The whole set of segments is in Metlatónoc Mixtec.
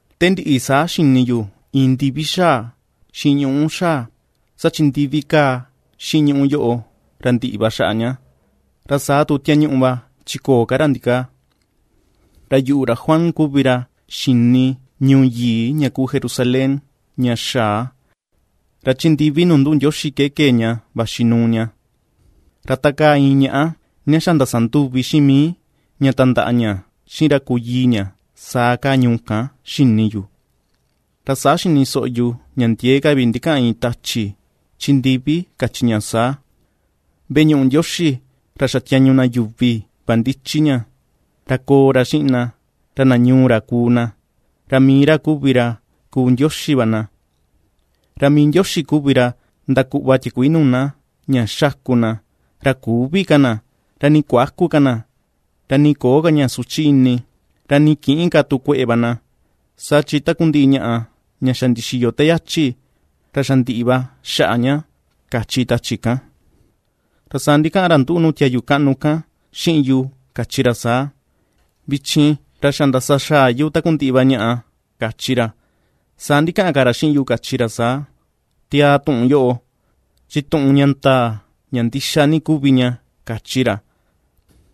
Te ndiꞌi saa xini yu iin ndivi xaa, xiꞌin ñuꞌú xaa, saa chi ndivi kaa xiꞌin ñuꞌú yoꞌo ra ndiꞌi va xaꞌa ña, ra saa tu tiañuꞌu va chi köo ka ra ndikaa. Ra yuꞌu, ra Juan, kuvi ra xini ñuu yii ña kuu Jerusalén ña xaa, ra chi ndivi nuu nduꞌu Ndioxi ke kee ña vaxi nuu ña, ra ta kaa iin ñaꞌá ña xa ndasanduvi xiꞌin mii, ña tandaꞌa ña xiꞌin ra kuu yii ña, saa kaa ñuu kan xini yu. Ra saa xini soꞌo yu ña ndiee ka vi ndikaꞌan iin tachi, chi ndivi kachi ña saa: ―Veꞌe ñuꞌu Ndioxi ra xa tiañu na yuvi va ndichi ña, ra koo ra xiꞌin na, ra na ñuu ra kuu na, ra mii ra kuvi ra kuu Ndioxi va na. Ra mii Ndioxi va kuvi ra ndakuꞌva tiakuii nuu na, ña xaku na, ra küvi ka na, ra nii kuäku ka na, ra nii köo ka ña suchi ini, ra nii kïꞌin ka tu kueꞌe va na; saa chi takundiꞌi ñaꞌa ña xa ndixiyo te yachi, ra xa ndiꞌi va xaꞌa ña ―kachi tachi kan. Ra saa ndikaꞌan ra nduꞌu nuu tiayu kaꞌnu kan xiꞌin yu kachi ra saa: ―Vichin ra xa ndasa xaa yu takundiꞌi va ñaꞌa ―kachi ra. Saa ndikaꞌan ka ra xiꞌin yu kachi ra saa: ―Tiaa tuꞌun yoꞌo, chi tuꞌun ña ndaa, ña ndixa ni kuvi ña ―kachi ra.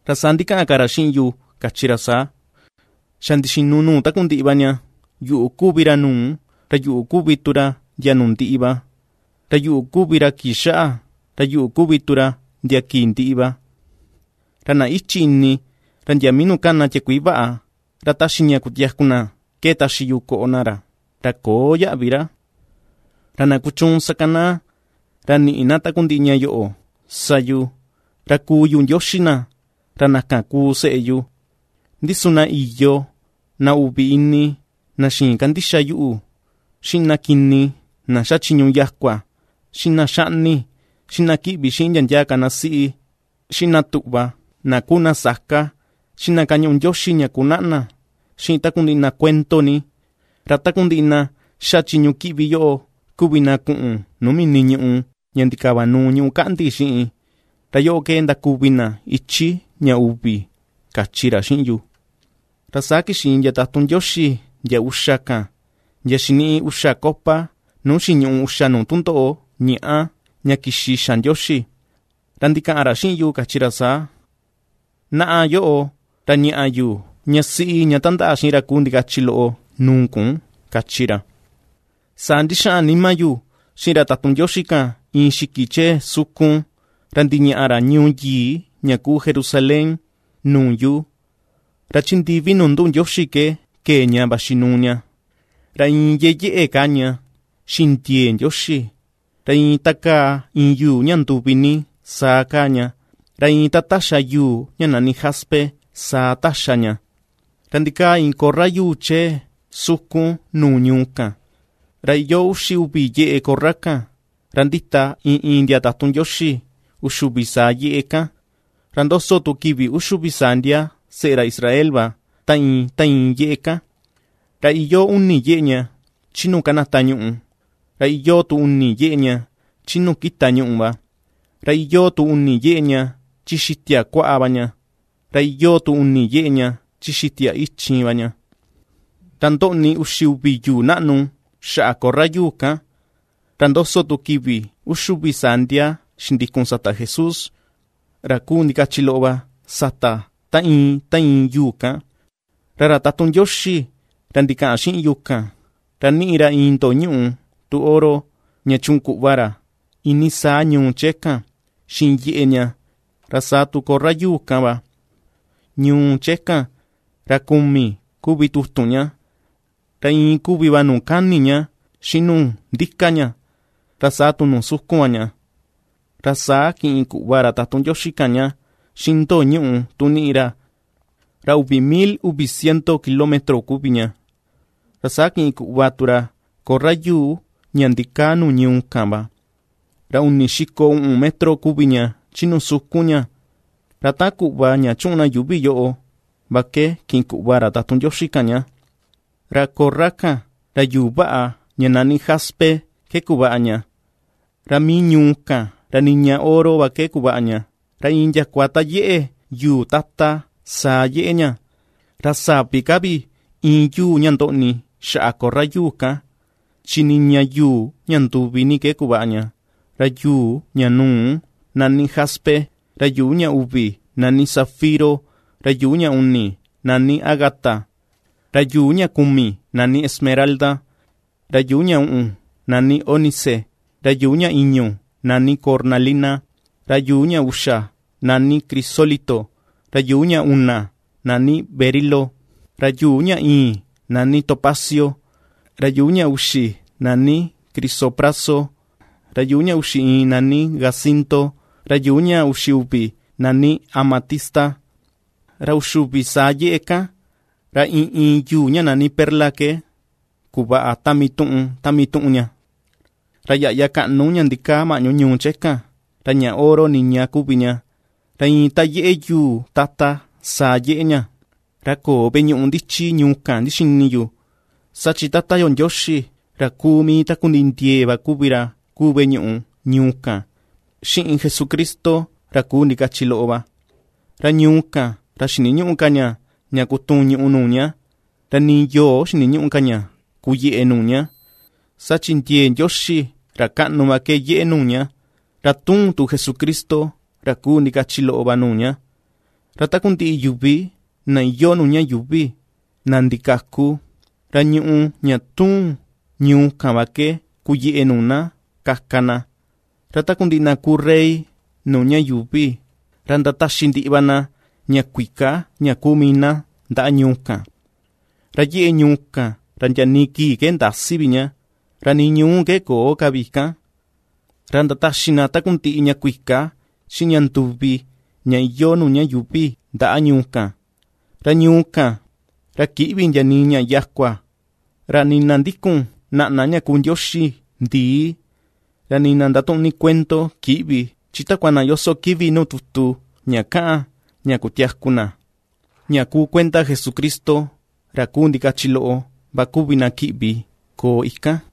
Ra saa ndikaꞌan ka ra xiꞌin yu, kachi ra saa: ―Xa ndixinu nuu takundiꞌi va ña. Yuꞌu kuvi ra nuu, ra yuꞌu kuvi tu ra ndia nuu ndiꞌi va, ra yuꞌu kuvi ra kii xaꞌa, ra yuꞌu kuvi tu ra ndia kii ndiꞌi va. Ra na íchi̱ ini, ra ndia mii nuu kana tiakuii vaꞌa, ra ^taxi ña kutiaku na ke taxi yu koꞌo na ra, ra köo yaꞌvi ra. Ra na kuchuun sakanaa, ra niꞌi na takundiꞌi ñaꞌa yoꞌo sa yu, ra kuu yu Ndioxi na, ra na kan kuu seꞌe yu. Ndi su na iyo, na uvi ini, na xïin kandixa yuꞌu, xiꞌin na kini na ^xa chiñu yakua, xiꞌin na ^xaꞌni, xiꞌin na kíꞌvi xiꞌin ndia ndia ka na siꞌi, xiꞌin na tuꞌva na kuu na saka, xiꞌin na ^kañuꞌu ndioxi ña ku naꞌna, xiꞌin takundiꞌi na kuendo ni, ra takundiꞌi na ^xa chiñu kiꞌvi yoꞌo kuvi na kuꞌun nuu mini ñùꞌù ña ndikavanuu ñuꞌú kaꞌndi xiꞌin, ra yoꞌo ke ndakuvi na ichi ña uvi ―kachi ra xiꞌin yu. Ra saa kixi iin ndia tatun Ndioxi ndia uxa kan, ndia xiniꞌi uxa copa nuu xiñuꞌu uxa nuu tundoꞌo ñàꞌa ña kixi xa Ndioxi, ra ndikaꞌan ra xiꞌin yu kachi ra saa: ―Naꞌa yoꞌo, ra ña̱ꞌa̱ yu ña siꞌi ña tandaꞌa xiꞌin ra kuu ndikachi loꞌo nuu kun ―kachi ra. Saa ndixaꞌan nima yu xiꞌin ra tatun Ndioxi kan iin xiki chee sukun, ra ndiñaꞌa ra ñuu yii ña kuu Jerusalén nuu yu. Ra chi ndivi nuu nduꞌu Ndioxi ke kee ña vaxi nuu ña. Ra iin ^yeyeꞌe kaa ña xiꞌin ndiee Ndioxi, ra iin ta kaa iin yuu ña nduvi ni saa kaa ña, ra iin ta taxa yuu ña nani jaspe saa taxa ña. Ra ndikaa iin korra yuu chee sukun nuu ñuu kan, ra iyoo uxi uvi yeꞌe korra kan. Ra ndita iin iin ndia tatun Ndioxi uxi uvi saa yeꞌe kan; ra ndoso tu kivi uxi uvi saa ndia seꞌe ra Israel va ta iin ta iin yeꞌe kan. Ra iyoo uni yeꞌe ña chi nuu kanata ñuꞌù, ra iyoo tu uni yeꞌe ña chi nuu kita ñuꞌù va, ra iyoo tu uni yeꞌe ña chi xitia kuaꞌa va ña, ra iyoo tu uni yeꞌe ña chi xitia ichin va ña. Ra ndoꞌni uxi uvi yuu naꞌnu xaꞌa korra yuu kan, ra ndoso tu kivi uxi uvi saa ndia xindikun sata Jesús, ra kuu ndikachi loꞌo va, sata ta iin ta iin yuu kan. Ra ra tatun Ndioxi ra ndikaꞌan xiꞌin yu kan, ra ^niꞌi ra iin ndo̱o̱ ñuꞌu tu oro, ña chuꞌun kuꞌva ra iinii saa ñuu chee kan, xiꞌin yeꞌe ña, ra saa tu korra yuu kan va. Ñuu chee kan, ra kumi kuvi tutun ña, ra iin kuvi va nuu kani ña xiꞌin nuu ndika ña ra saa tu nuu sukun va ña. Ra saa kiꞌin kuꞌva ra tatun Ndioxi kan ña, xiꞌin ndo̱o̱ ñuꞌu tu niꞌi ra, ra uvi mil uvi ciento kilómetro kuvi ña. Ra saa kiꞌin kuꞌva tu ra korra yuu ña ndikaa nuu ñuu kan va: Ra uni xiko uꞌun metro kuvi ña chi nuu sukun ña, ra taꞌan kuꞌva ña chuꞌun na yuuvi yoꞌo va ke, kiꞌin kuꞌva ra tatun Ndioxi kan ña. Ra korra kan ra yuu vaꞌa ña nani jaspe ke kuvaꞌa ña, ra mii ñuu kan ra niña oro va ke kuvaꞌa ña, ra iin ndiakua ta yeꞌe yuu tata, saa yeꞌe ña. Ra sa̱ví ka vi íin yuu ña ndoꞌni xaꞌa korra yuu kan, chi niña yuu ña nduvi ní ke kuvaꞌa ña: ra yuu ña nuu nani jaspe, ra yuu ña uvi nani zafiro, ra yuu ña uni nani ágata, ra yuu ña kumi nani esmeralda; ra yuu ña uꞌun nani ónice, ra yuu ña i̱ñu̱ nani cornalina, ra yuu ña uxa nani crisólito, ra yuu ña una nani berilo, ra yuu ña ìi̱n nani topacio, ra yuu ña uxi nani crisopraso, ra yuu ña uxi iin nani jacinto, ra yuu ña uxi uvi nani amatista. Ra uxi uvi saa yeꞌe kan, ra iin iin yuu ña nani perla ke kuvaꞌa ta mii tuꞌun ta mii tuꞌun ña. Ra yaꞌya kaꞌnu ña ndikaa maꞌñu ñuu chee kan, ra ña oro niña kuvi ña, ra iin ta yeꞌe yuu tata saa yeꞌe ña. Ra köo veꞌe ñuꞌu ndichi ñuu kan ndixini yu, saa chi Tata yo Ndioxi ra kuu mii takundiꞌi ndiee va kuvi ra kuu veꞌe ñuꞌu ñuu kan xiꞌin Jesucristo ra ku ndikachi loꞌo va. Ra ñuu kan ra xiniñüꞌu ka ña, ña kutuun ñuꞌù nuu ña, ra ni yoo xiniñüꞌu ka ña kuyeꞌe nuu ña, saa chi ndiee Ndioxi ra kaꞌnu va ke yeꞌe nuu ña, ra tuun tu Jesucristo ra kuu ndikachi loꞌo va nuu ña. Ra takundiꞌi yuvi na iyoo nuu ña yuuvi, na ndikaku, ra ñùꞌù ña tuun ñuu kan va ke kuyeꞌe nuu na kaka na, ra takundiꞌi na kuu rey nuu ña yuuvi, ra ndataxi ndiꞌi va na ña kuika ña ku mii na, ndaꞌa ñuu kan. Ra yeꞌe ñuu kan ra ndia nii kii ke ndäsi vi ña, ra nii ñuú ke köo ka vi ikan. Ra ndataxi na takundiꞌi ña kuika xiꞌin ña nduvi ña iyoo nuu ña yuuvi ndaꞌa ñuu kan. Ra ñuu kan, ra kïꞌvi ndia nii ña yakua, ra nii na ndikun naꞌna ña kuu ndioxi ndii, ra nii na ndatuꞌun ni kuendo, kïꞌvi. Chi takua na yoso kivi nuu tutu ña kaꞌan ña kutiaku na, ña kuu kuenda Jesucristo ra ku ndikachi loꞌo va kuvi na kiꞌvi koo ikan.